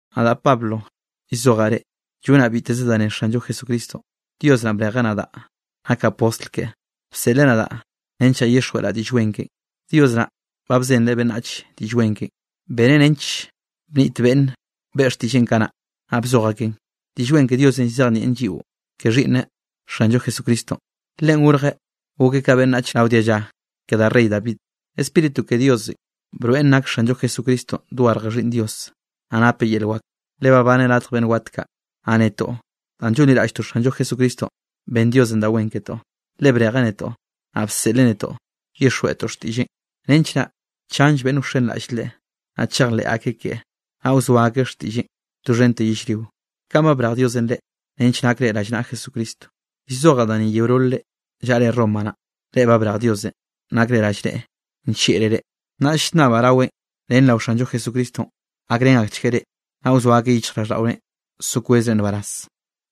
Nadaꞌ Pablo llzojaꞌ reꞌ. Llonaꞌ biteze da ne Xanllo Jesucristonꞌ. Dios naꞌ brejeꞌ nadaꞌ nakaꞌ postl keꞌe, bseꞌleꞌ nadaꞌ nench naꞌ llyixjweꞌraꞌ Diꞌll Wen keꞌen. Dios naꞌ ba bzenreꞌ beꞌnnachenꞌ Diꞌll Wen keꞌen, beneꞌ nench bniꞌt beꞌnn beꞌe ak xtiꞌlleꞌn kanaꞌ, naꞌ bzoj akeꞌn. Diꞌll Wen ke Diosenꞌ llzejnieꞌn lliꞌo ke Xhiꞌnneꞌ Xanllo Jesucristonꞌ. Leꞌen gorjeꞌ gokeꞌ ka beꞌnnach rao dialla ke da rey David. Spíritu ke Diosenꞌ broeꞌn nak Xanllo Jesucristonꞌ dogarje Xhiꞌnn Dios, naꞌ napeꞌ yel wak, le babaneꞌ radj beꞌnn wat kaꞌ. Naꞌ netoꞌ danꞌ llonliraꞌlltoꞌ Xanllo Jesucristonꞌ, ben Diosenꞌ da wen ketoꞌ, le brejeꞌ netoꞌ, naꞌ bseꞌleꞌ netoꞌ llyixjweꞌtoꞌ xtiꞌlleꞌn, nench naꞌ chanll beꞌnn wxenraꞌll Leꞌe, naꞌ chejleꞌ akeꞌ keꞌe, naꞌ wzoa akeꞌ xtiꞌlleꞌn doxhente yellrio. Kaꞌn ba brej Diosenꞌ reꞌ, nench nakre rallnaꞌa Jesucristonꞌ. Llzojaꞌ da ni ke yeololre llaꞌre Roma naꞌ, reꞌ ba brej Diosenꞌ nakre rallneꞌe, nllieꞌreꞌ reꞌ. Naꞌll llnnabaꞌ raweꞌn ren rao Xanllo Jesucristonꞌ gakrén akchgueꞌ reꞌ, naꞌ wzoa akeꞌ yichjraꞌlldaꞌore so kwezre nbaraz.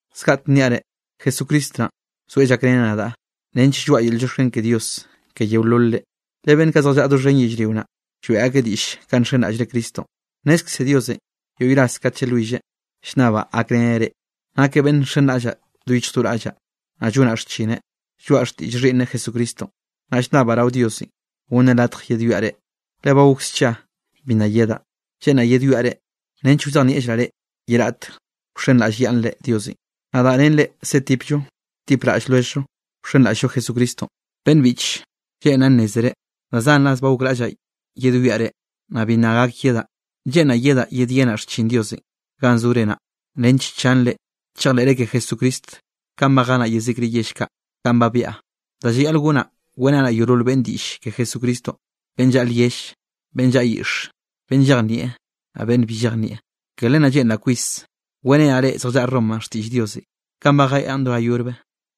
Zgaꞌtek nniaꞌ reꞌ, Jesucristo naꞌn, zoeꞌ llakreneꞌ nadaꞌ nench lloaꞌa yel llioxken ke Diosenꞌ ke yeololre, le beꞌnn kaꞌ zjallaꞌa doxhen yellrio naꞌ, lloeꞌ akeꞌ diꞌll kanꞌ nxenraꞌllre Cristonꞌ. Nnezkze Diosenꞌ yoꞌy ras kat llalwilleꞌn, llnnabaꞌ gakreneꞌ reꞌ. Nakeꞌ beꞌnn nxenraꞌllaꞌ do yichj do raꞌllaꞌ, naꞌ llonaꞌ xchineꞌ, lloaꞌa xtiꞌll Xhiꞌnneꞌ Jesucristonꞌ. Naꞌ llnnabaꞌ rao Diosenꞌ gonneꞌ latj yedwiaꞌ reꞌ, le ba gok scha bi nna yedaꞌ. Lleꞌnraꞌ yedwiaꞌ reꞌ, nench wzejnieꞌllraꞌ reꞌ ye raꞌt wxenraꞌllyaꞌnnre Diosenꞌ. Nadaꞌ ren reꞌ setipllo wtipraꞌll lwelljllo wxenraꞌll-llo Jesucristonꞌ. Beꞌnn biꞌche, lleꞌnraꞌ nnézere da zan ras ba gokraꞌllaꞌ yedwiaꞌ reꞌ, naꞌ bi nna gak yedaꞌ. Lleꞌnraꞌ yedaꞌ yedyenaꞌ xchin Diosenꞌ ganꞌ zore naꞌ, nench chanre chejleꞌre ke Jesucristo kanꞌ ba jenaꞌ yezikre yell kaꞌ ganꞌ ba byaꞌa. Da llayaꞌl gonaꞌ weꞌrenaꞌ yeolol beꞌnne diꞌll ke Jesucristonꞌ beꞌnn llaꞌa lyell, beꞌnn llaꞌa yiꞌxe, beꞌnn llejnieꞌ, naꞌ beꞌnn bi llejnieꞌ. Ke len naꞌ lleꞌnraꞌ kwis weꞌrenaꞌ reꞌ zjallaꞌa Romanꞌ xtiꞌll Diosenꞌ kanꞌ ba jeaꞌn do ga yobre.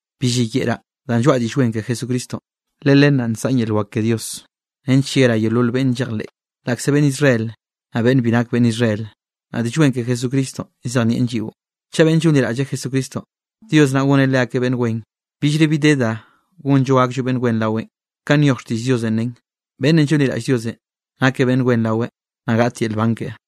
Bi lliyeꞌraꞌ danꞌ lloaꞌa Diꞌll Wen ke Jesucristonꞌ, le len naꞌ nsaꞌn yel wak ke Dios nench yerá yeolol beꞌnn llejleꞌ, laꞌkze beꞌnn Israel, naꞌ beꞌnn bi nak beꞌnn Israel. Naꞌ Diꞌll Wen ke Jesucristonꞌ llzejnieꞌn lliꞌo, chaꞌ beꞌnn llonliraꞌlle Jesucristonꞌ, Dios naꞌ goneꞌ leakeꞌ beꞌnn wen, billre bi de da gonllo gakllo beꞌnn wen raweꞌn. Kanꞌ nyoj xtiꞌll Diosenꞌ nen: “Beꞌnnenꞌ llonliraꞌll Diosenꞌ, nakeꞌ beꞌnn wen raweꞌ, naꞌ gaꞌt yel nban keꞌe.”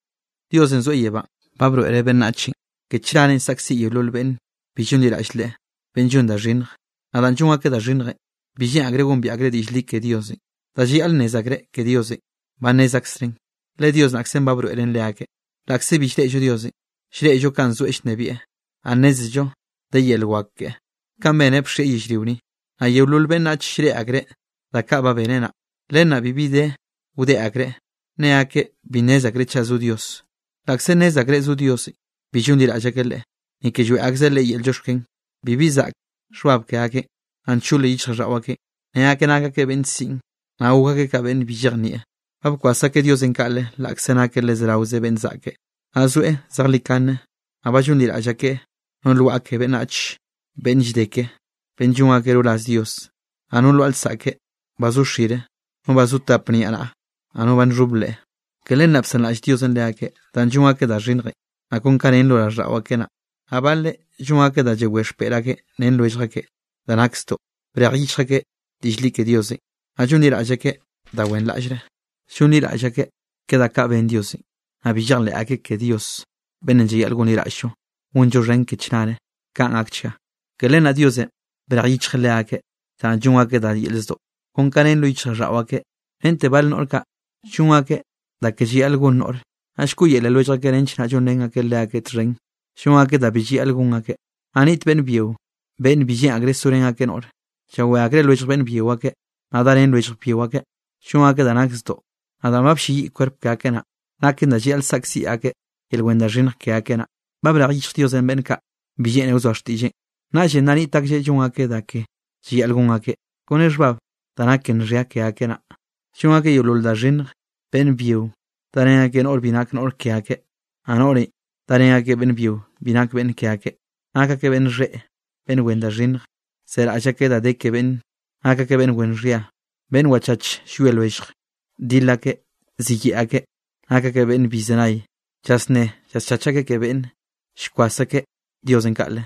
Diosenꞌ zoeꞌ yebánꞌ ba broeꞌreꞌ beꞌnnachenꞌ, ke chnarenꞌ saꞌkziꞌ yeolol beꞌnne bi llonliraꞌll Leꞌe, beꞌnn llon da xhinnj. Naꞌ danꞌ llon akeꞌ da xhinnjenꞌ, bi lleꞌn akreꞌ gombiaꞌ akeꞌ diꞌll li ke Diosenꞌ. Da llayaꞌl nnez akreꞌ ke Diosenꞌ, ba nnez aksreꞌn, le Dios naꞌkzenꞌ ba broeꞌreꞌn leakeꞌ. Laꞌkze bi llreꞌllo Diosenꞌ, llreꞌllo kanꞌ zoeꞌ llnebieꞌ, naꞌ nnézello de yel wak keꞌe kanꞌ beneꞌ bxieꞌ yellrio ni, naꞌ yeolol beꞌnnach llreꞌe akreꞌ da kaꞌ ba beneꞌ naꞌ. Len naꞌ bibi de wdeꞌ akreꞌ, ne akeꞌ bi nnez akreꞌ chaꞌ zo Dios. Laꞌkze nnez akreꞌ zo Diosenꞌ, bi llonliraꞌll akeꞌ Leꞌe, ni ke lloeꞌ akzeꞌ Leꞌe yel llioxken. Bibi zaꞌk xhbab ke akeꞌn, naꞌ nchol yichjraꞌlldaꞌo akeꞌ. Ne akeꞌ nak akeꞌ beꞌnn siꞌn, naꞌ gok akeꞌ ka beꞌnn bi llejnieꞌ. Ba bkwas akeꞌ Diosenꞌ kaꞌle, laꞌkze nakeꞌ le zerawe beꞌnn zaꞌke, naꞌ zoeꞌ zejlikane. Naꞌ ba llonliraꞌll akeꞌ no lwaꞌa ke beꞌnnach beꞌnn llde ke, beꞌnn llon akeꞌ roraz Dios, naꞌ no lwaꞌa lsaꞌke ba zo xire, no ba zo tap niaꞌnaꞌa, naꞌ no ba nxhob leꞌe. Ke len naꞌ bsanraꞌll Diosenꞌ leakeꞌ, danꞌ llon akeꞌ da xhinnjenꞌ, naꞌ kon kanꞌ nen lo raꞌlldaꞌo akeꞌ naꞌ, naꞌ baleꞌ llon akeꞌ da llawé xpeꞌr akeꞌ ren lwellj akeꞌ da nak zdoꞌ. Brej yichj akeꞌ diꞌll li ke Diosenꞌ, naꞌ llonliraꞌll akeꞌ da wenraꞌllre. Llonliraꞌll akeꞌ ke da kaꞌ ben Diosenꞌ, naꞌ bi llejleꞌ akeꞌ ke Dios beꞌnnenꞌ llayaꞌl gonliraꞌll-llo, gonllo xhen ke chnare. Kaꞌn gakchga. Ke len naꞌ Diosenꞌ brej yichjeꞌ leakeꞌ danꞌ llon akeꞌ da yel zdoꞌ, kon ka nen lo yichjraꞌlldaꞌo akeꞌ. Rente bal noꞌr kaꞌ llon akeꞌ da ke llayaꞌl gon noꞌre, naꞌ llkoꞌyele lwellj akeꞌ nench naꞌ llonrén akeꞌ leakeꞌ txhen, llon akeꞌ da bi llayaꞌl gon akeꞌ. Naꞌ niꞌt beꞌnn byio beꞌnn bi lleꞌn akreꞌ sorén akeꞌ noꞌre, llawé akreꞌ lwellj beꞌnn byio ake, naꞌ darén lwellj byio akeꞌ, llon akeꞌ da nak zdoꞌ. Naꞌ danꞌ ba blleyiꞌ kwerp ke akeꞌ naꞌ, naken da llayaꞌl saꞌkziꞌ akeꞌ yel wen da xhinnj ke akeꞌ naꞌ. Ba brej yichj Diosenꞌ beꞌnn kaꞌ bi lleꞌne wzoa xtiꞌlleꞌn, naꞌllenꞌ nna niꞌt aklleꞌ llon akeꞌ da ke llayaꞌl gon akeꞌ, kone xhbab da nak ke nxhia ke akeꞌ naꞌ. Llon akeꞌ yeolol da xhinnje, beꞌnn byio darén akeꞌ noꞌr bi nak noꞌr ke akeꞌ, naꞌ noꞌre darén akeꞌ beꞌnn byio bi nak beꞌnn ke akeꞌ, nak akeꞌ beꞌnn xheꞌe, beꞌnn wen da xhinnj, zeraꞌll akeꞌ da de ke beꞌnne, nak akeꞌ beꞌnn wen xhia, beꞌnn wachach llwie lwelljeꞌ, dil akeꞌ, ziyeꞌe akeꞌ, nak akeꞌ beꞌnn bi llzenay. Llasnné llaschach akeꞌ ke beꞌnne, llkwas akeꞌ Diosenꞌ kaꞌle,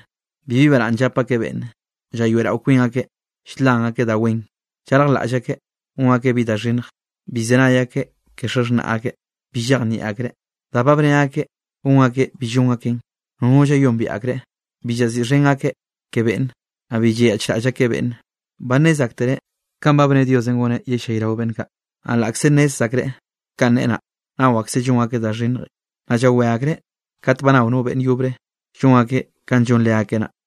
bibi baraꞌnn llap akeꞌ beꞌnne. Llayoeꞌrao kwin akeꞌ ll-lan akeꞌ da wen, llarjlaꞌll akeꞌ gon akeꞌ bi da xhinnj, bi llzenay akeꞌ ke xaxhnaꞌ akeꞌ. Bi llejnieꞌ akreꞌ, da ba bne akeꞌ gon akeꞌ bi llon akeꞌn, nono llayombiaꞌ akreꞌ, bi llaziꞌxhen akeꞌ ke beꞌnne, naꞌ bi llayaꞌchraꞌll akeꞌ beꞌnne. Ba nnez aktereꞌ kanꞌ ba bne Diosenꞌ goneꞌ yellayrao beꞌnn kaꞌ. Naꞌ laꞌkze nnez akreꞌ kanꞌ neꞌe naꞌ, nao akseꞌ llon akeꞌ da xhinnjenꞌ, naꞌ llawé akreꞌ kat ba nao beꞌnn yobre llon akeꞌ kanꞌ llon leakeꞌ naꞌ.